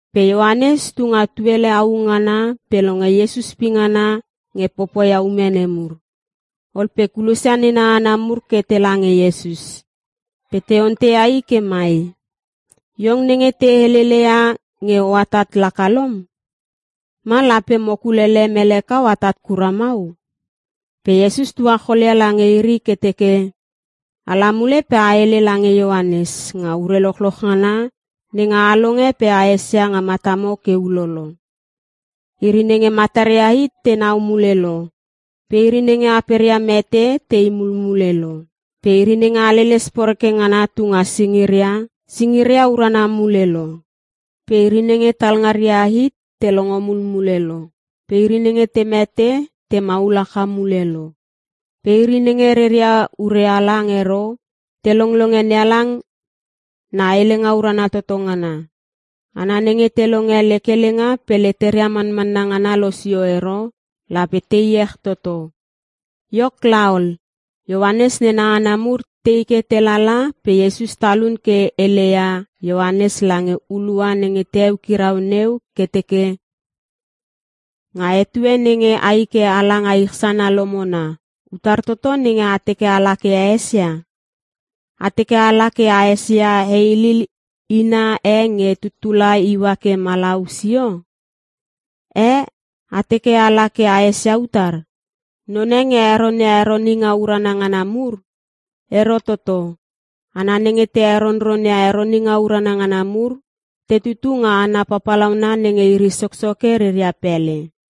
Pe Ioanes tu nga tuele au ngana pe longe Iesus pingana nge popoia ume nemur. Ol pe kulosia nena hana mur ke tela nge Iesus. Pe te onteia I ke mai, “Iong nenge te heleleia nge o atat laka lom? Ma, lape mo kulele mele kau atat kura mau?” Pe Iesus tuacholia lange iri ke teke, “Ala mule pe a hele lange Ioanes nga ure lochloch ngana nenge a longe pe a esia nga matamo ke ulolo. Iri nenge mataria hit tenau mule lo pe iri nenge aperia mete te i mulmule lo. Pe iri nenge haleles poreke ngana tu nga singiria, singiria urana mule lo. Pe iri nenge talngaria hit te longo mulmule lo pe iri nenge te mete te maul haka mule lo. Pe iri nenge reria ure halang ero, te longlonge NeHalang na Helenga Urana Toto Ngana. Hana nenge te longe lek helenga pe leteria manmanna ngana losio ero, lape te iech toto!” Iok laol, Ioanes nena hana mur te i ke te lala pe Iesus talun ke heleia Ioanes lange hulua nenge te eukirau neu ke teke, “Nga etue nenge ai ke a la nga ich sana lomona, utar toto nenge a teke a la ke a esia? A teke a la ke a esia heilil ina e nge tuttula iua ke malau sio? Eh, a teke a la ke a esia utar? Non e nge heronia heroninga urana ngana mur? Ero toto. Hana nenge te heronronia heroninga urana ngana mur, te tutu nga hana papalauna nenge iri Soksoke reria pele.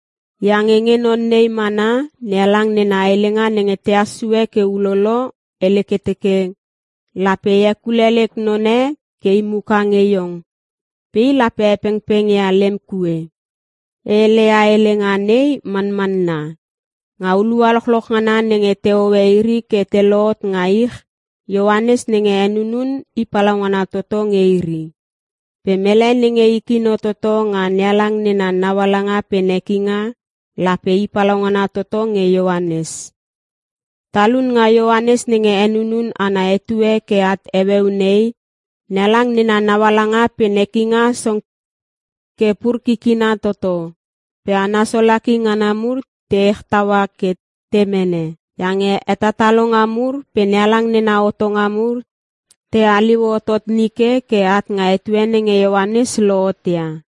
Iange nge non nei mana, NeHalang nena helenga nenge tehas sue ke ulolo, hele ke teke, “‘Lape e hekule lek none ke i muka nge iong pe i lape hepengpeng ia lem kue.’ “E hele ia helenga nei manmanna. Nge hulua lochloch ngana nenge te hoe iri ke te lohot nga ich, Ioanes nenge henunun i palaungana toto nge iri. Pe mele nenge i kino toto nga NeHalang nena naualanga pe nekinga, lape i palaungana toto nge Ioanes. Talun nga Ioanes nenge henunun ana etue ke at heueu nei, NeHalang nena naualanga pe nekinga song ke pur kikina toto. Pe hana solaki ngana mur te ech taua ke te mene. Iange hetatalonga mur pe NeHalang nena hotonga mur te haliu hotot nike ke at nga etue nenge Ioanes lohot ia.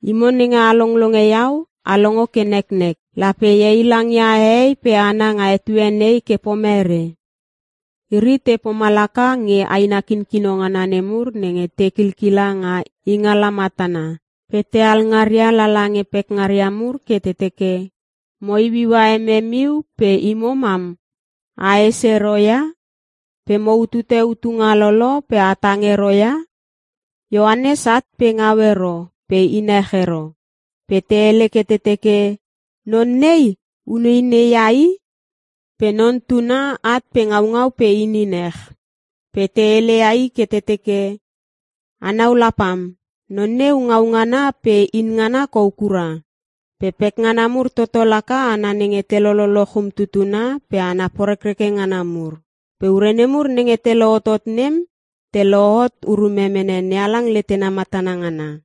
Imo nenge a longlonge iau, a longo ke neknek. “Lape e heilangia hehei pe hana nga etue nei ke pomere? Iri te pomalaka nge aina kinkino ngana nemur nenge te kilkila nga ingala matana pe te alngaria lala nge pekngaria mur ke te teke, “‘Mo iuiua emem iu pe imo mam a hes ero ia? Pe mo utute utunga lolo pe a tang ero ia?’ “Ioanes at pe ngau ero pe in ech ero. Pe te hele ke te teke, ‘Non nei, uneinei ia i.’ Pe Non Tuna, at pe ngaungau pe inin ech. Pe te heleia i ke te teke, ‘A nau la pam, non neu ngau ngana pe in ngana kou kura. Pe pekngana mur toto laka hana nenge te lololoch umtutuna pe hana porekreke ngana mur.’ Pe ure nemur nenge te lohotot nem, te lohot urume mene NeHalang letena matana ngana.”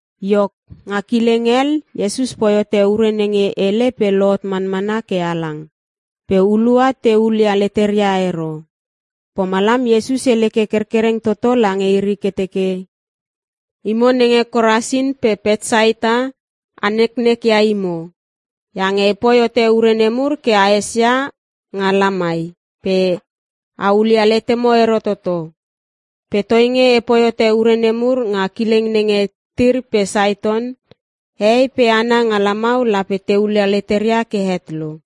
Iok, nga kileng hel, Iesus poi hote ure nenge hele pe lohot manmana ke halang, pe hulua te hulia leteria ero. Pomalam Iesus hele ke kerkereng toto lange iri ke teke, “Imo nenge Korasin pe Petsaita a neknek ia imo. Iange e poi hote ure nemur ke a esia nga lamai pe a hulia letemo ero toto. Pe toinge e poi hote ure nemur nga kileng nenge Tir pe Saiton, hehei pe hana nga lamau lape te hulia leteria ke het lo.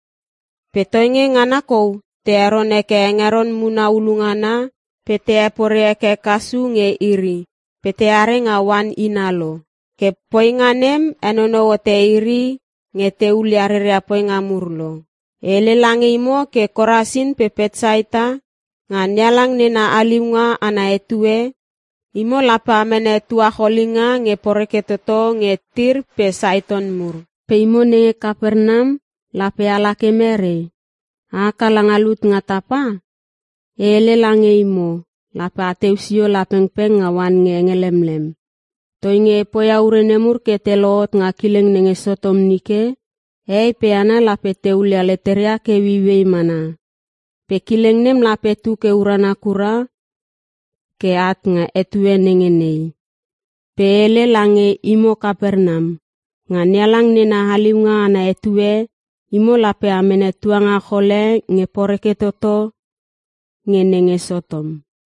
Pe toinge ngana kou te heron heke hengeron muna hulu ngana, pe te hepore heke kasu nge iri pe teare nga oan ina lo. Ke poinga nem henonou hote iri nge te hulia reria poinga mur lo. E hele lange imo Korasin pe Petsaita, nga NeHalang nena haliunga ana etue, imo lape a mene tuacholinga nge poreke toto nge Tir pe Saiton mur. Pe imo nenge Kapernam lape ala ke merei? A haka langa lut nga tapa? E hele lange imo, lape ateu sio la pengpeng nga oan nge henge lemlem. Toinge e poia ure nemur ke te lohot nga kileng nenge Sotom nike, hehei pe hana lape te hulia leteria ke ueiuei mana. Pe kileng nem lape tu ke urana kura ke at nga etue nenge nei. Pe e hele lange imo Kapernam, nga NeHalang nena haliunga ana etue, imo lape a mene tuangachol e nge poreke toto nge nenge Sotom.”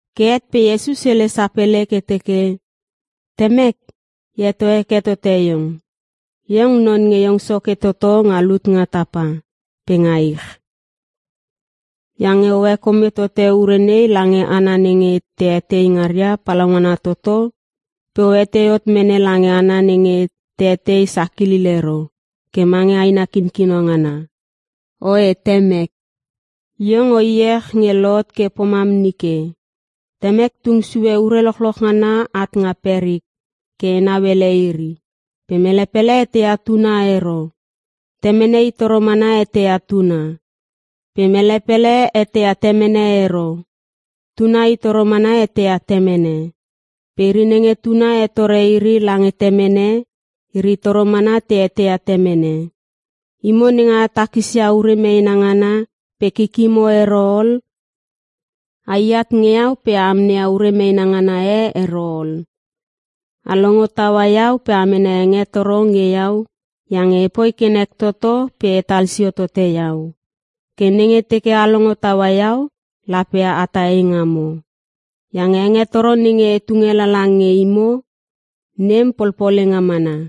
Ke het pe Iesus hele sapele ke teke, “Temek! E heto heke tote Iong. Iong Non nge Iong Soke toto nga lut nga tapa pe nga ich. Iange o hekome tote ure nei lange hana nenge te etei ngaria palaungana toto pe o etei hot mene lange hana nenge te etei sakilil ero ke mange aina kinkino ngana. Oe Temek, Iong o iech nge lohot ke pomam nike. “Temek tung sue ure lochloch ngana at nga perik ke e nauele iri. Pe mele pele eteia Tuna ero. Temene I toro mana eteia Tuna. Pe mele pele eteia Temene ero. Tuna i toro mana eteia Temene. Pe iri nenge Tuna hetore iri lange Temene, iri toro mana te eteia Temene. “Imo nenge a takisia ure meena ngana pe kikimo ero ol, ai at nge iau pe a amneia ure meena ngana e ero ol. A longo taua iau pe a mene hengetoro nge iau iange e poi ke nek toto pe e tal sio tote Iau. Ke nenge teke a longo taua iau lape atah eingamo. Iange hengetoro nenge e tunge lala nge imo nem polpolenga mana.”